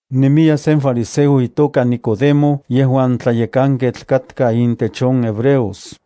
Nemiya sen fariseo itoka Nicodemo yejuan tlayekanketl katka intech on hebreos.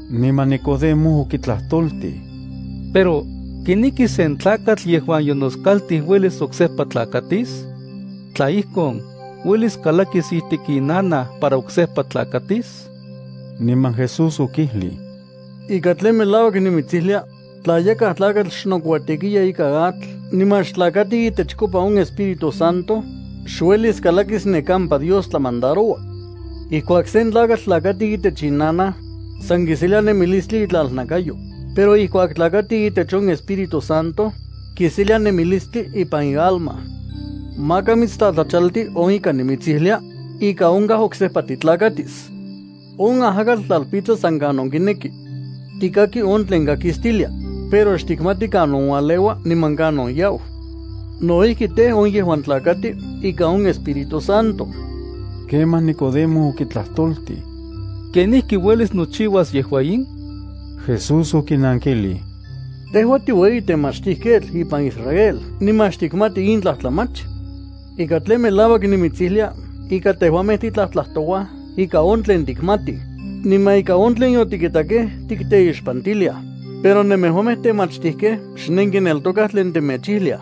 Niman Nikodemo okitlajtoltij: —Pero ¿kenijki sen tlakatl yejuan yonoskaltij uelis oksejpa tlakatis? ¿Tla ijkon, uelis kalakis ijtik inanaj para oksejpa tlakatis? Niman Jesús okijlij: —Ika tlen melauak nimitsijlia, tla yakaj tlakatl xnokuatekiya ikan atl niman xtlakati itechkopa on Espíritu Santo, xuelis kalakis ne kampa Dios tlamandaroua. Ijkuak sen tlakatl tlakati itech inanaj, san kiselia nemilistli itlalnakayo, pero ijkuak tlakati itech on Espíritu Santo, kiselia nemilistli ipan ialma. Maka mitstlatlachalti on ika nimitsijlia: “Ika onkaj oksejpa titlakatis.” On ajakatl tlalpitsa san kanon kineki. Tikaki on tlen kakistilia, pero xtikmati kanon ualeua niman kanon yau. No ijki tej, on yejuan tlakatij ikan on Espíritu Santo. Kemaj Nicodemo okitlajtoltij: —¿Kenijki uelis nochiuas yejua in? Jesús okinankilij: —¿Tejua tiueyitemachtijketl ipan Israel niman xtikmati in tlajtlamach? Ika tlen melauak nimitsijlia ika tejuamej titlajtlajtouaj ika on tlen tikmatij, niman ika on tlen yotikitakej tikteixpantiliaj, pero nemejuamej temachtijkej xnenkineltokaj tlen temechijliaj.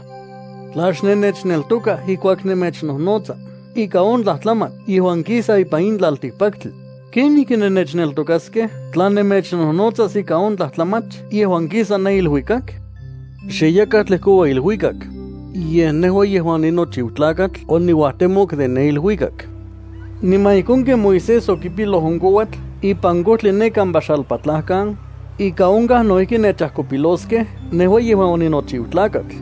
Tla xnennechneltokaj ijkuak nemechnojnotsa ika on tlajtlamach yejuan kisa ipan in tlaltikpaktli, ¿kenijki nennechneltokaskej tla nemechnojnotsas ika on tlajtlamach yejuan kisa ne iluikak? Xe yakaj tlejkoua iluikak, yej nejua yejuan oninochiu Tlakatl oniuajtemok de ne iluikak. Niman ijkon ken Moisés okipiloj on kouatl ipan kojtli ne kampa xalpatlajkan, ika onkaj no ijki nechajkopiloskej nejua yejuan oninochiu Tlakatl,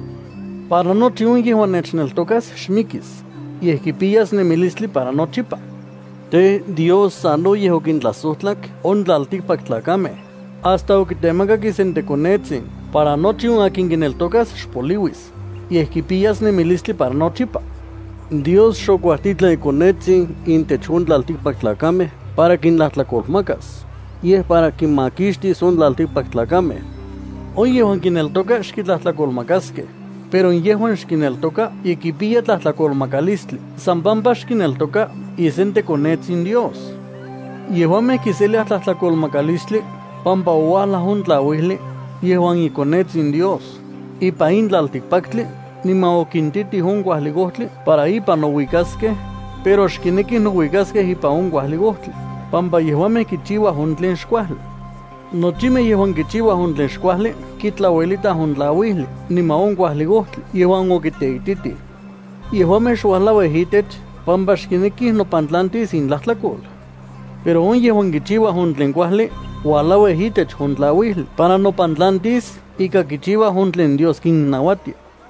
para nochi on yejuan nechneltokas xmikis, yej kipiyas nemilistli para nochipa. ’Tej, Dios sanoyej okintlajsojtlak on tlaltikpaktlakamej, hasta okitemakak isenteKonetsin para nochi on akin kineltokas xpoliuis, yej kipiyas nemilistli para nochipa. Dios xokuajtitlan iKonetsin intech on tlaltikpaktlakamej para kintlajtlakolmakas, yej para on kimakixtis on tlaltikpaktlakamej. ’On yejuan kineltoka xkitlajtlakolmakaskej, pero yejuan xkineltoka ye kipiya tlajtlakolmakalistli san pampa xkineltoka isenteKonetsin Dios. Yejuamej kiseliaj tlajtlakolmakalistli pampa ouajlaj on tlajuijli, yejuan iKonetsin Dios, ipan in tlaltikpaktli niman okintitij on kuajli ojtli para ipan nouikaskej, pero xkinekij nouikaskej ipan on kuajli ojtli, pampa yejuamej kichiuaj on tlen xkuajli. Nochimej yejuan kichiuaj on tlen xkuajli kitlauelitaj on tlauijli niman on kuajli ojtli yejuan okiteititij. Yejuamej xuajlauij itech pampa xkinekij nopantlantis intlajtlakol. Pero on yejuan kichiuaj on tlen kuajli uajlauij itech on tlauijli para nopantlantis ika kichiuaj on tlen Dios kinnauatia.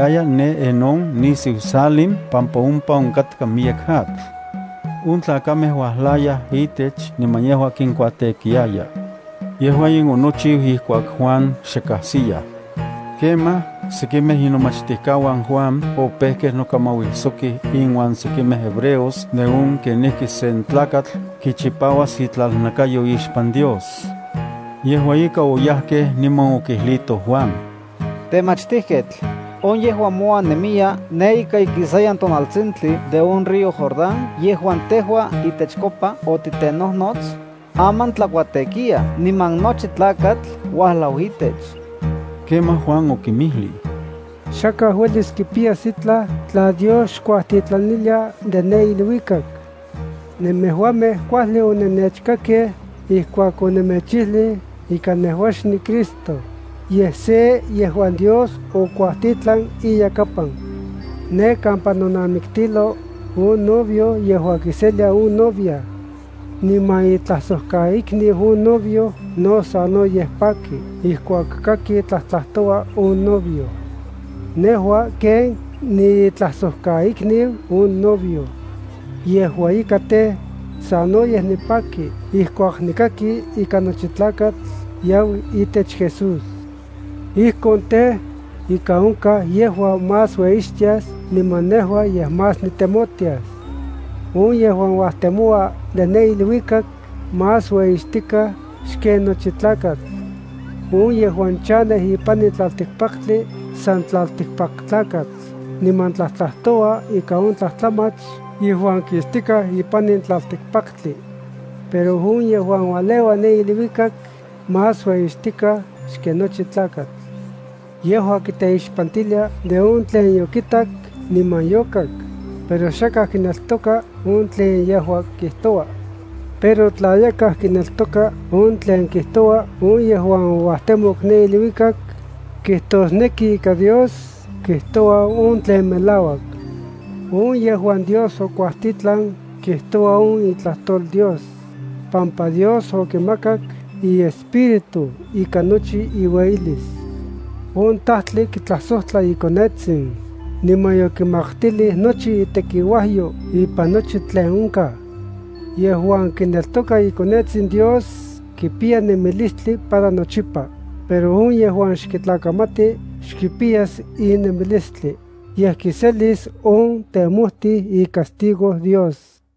No ijki, Juan tlakuatekiaya ne Enón nisiu Salim pampa ompa onkatka miyek atl. On tlakamej uajlayaj itech niman yejua kinkuatekiaya. (Yejua in onochiu ijkuak Juan xe kajsiyaj.) Kemaj, sekimej inomachtijkauan Juan opejkej nokamauijsokij inuan sekimej hebreos de on kenijki sen tlakatl kichipauas itlalnakayo ixpan Dios. Yejua ika oyajkej niman okijlijtoj Juan: —Temachtijketl, on yejuan mouan nemiya ne ika ikisayan tonaltsintli de on río Jordán yejuan tejua itechkopa otitenojnots, aman tlakuatekiya niman nochi tlakatl uajlau itech. Kemaj Juan okinmijlij: —Xakaj uelis kipiyas itlaj tla Dios xkuajtitlanilia de ne iluikak. Nemejuamej kuajli onennechkakej ijkuak onemechijlij ika nejua xniCristo, yej se yejuan Dios okuajtitlan iyakapan. Ne kampa nonamiktilo, on novio yejua kiselia on novia. Niman itlajsojkaikniu on novio no sanoyej paki ijkuak kaki tlajtlajtoua on novio. Nejua ken niitlajsojkaikniu on novio. Yejua ika tej, sanoyej nipaki ijkuak nikaki ika nochi tlakatl yau itech Jesús. Ijkon tej, ika onkaj yejua más ueyixtias niman nejua yej más nitemotias. ’On yejuan uajtemoua de ne iluikak más ueyixtikaj xken nochi tlakatl. On yejuan chanej ipan in tlaltikpaktli san tlaltikpaktlakatl niman tlajtlajtoua ika on tlajtlamach yejuan kistikaj ipan in tlaltikpaktli. Pero on yejuan ualeua ne iluikak más ueyixtikaj xken nochi tlakatl. Yejua kiteixpantilia de on tlen yokitak niman yokak, pero xakaj kineltoka on tlen yejua kijtoua. Pero tla yakaj kineltoka on tlen kijtoua on yejuan ouajtemok ne iluikak, kijtosneki ika Dios kijtoua on tlen melauak. On yejuan Dios okuajtitlan kijtoua on itlajtol Dios, pampa Dios okimakak iEspíritu ikan nochi iueyilis. On Tajtli kitlajsojtla iKonetsin, niman yokimaktilij nochi itekiuajyo ipan nochi tlen onkaj. Yejuan kineltoka iKonetsin Dios kipiya nemilistli para nochipa, pero on yejuan xkitlakamati xkipiyas in nemilistli, yej kiselis on temojtij icastigo Dios.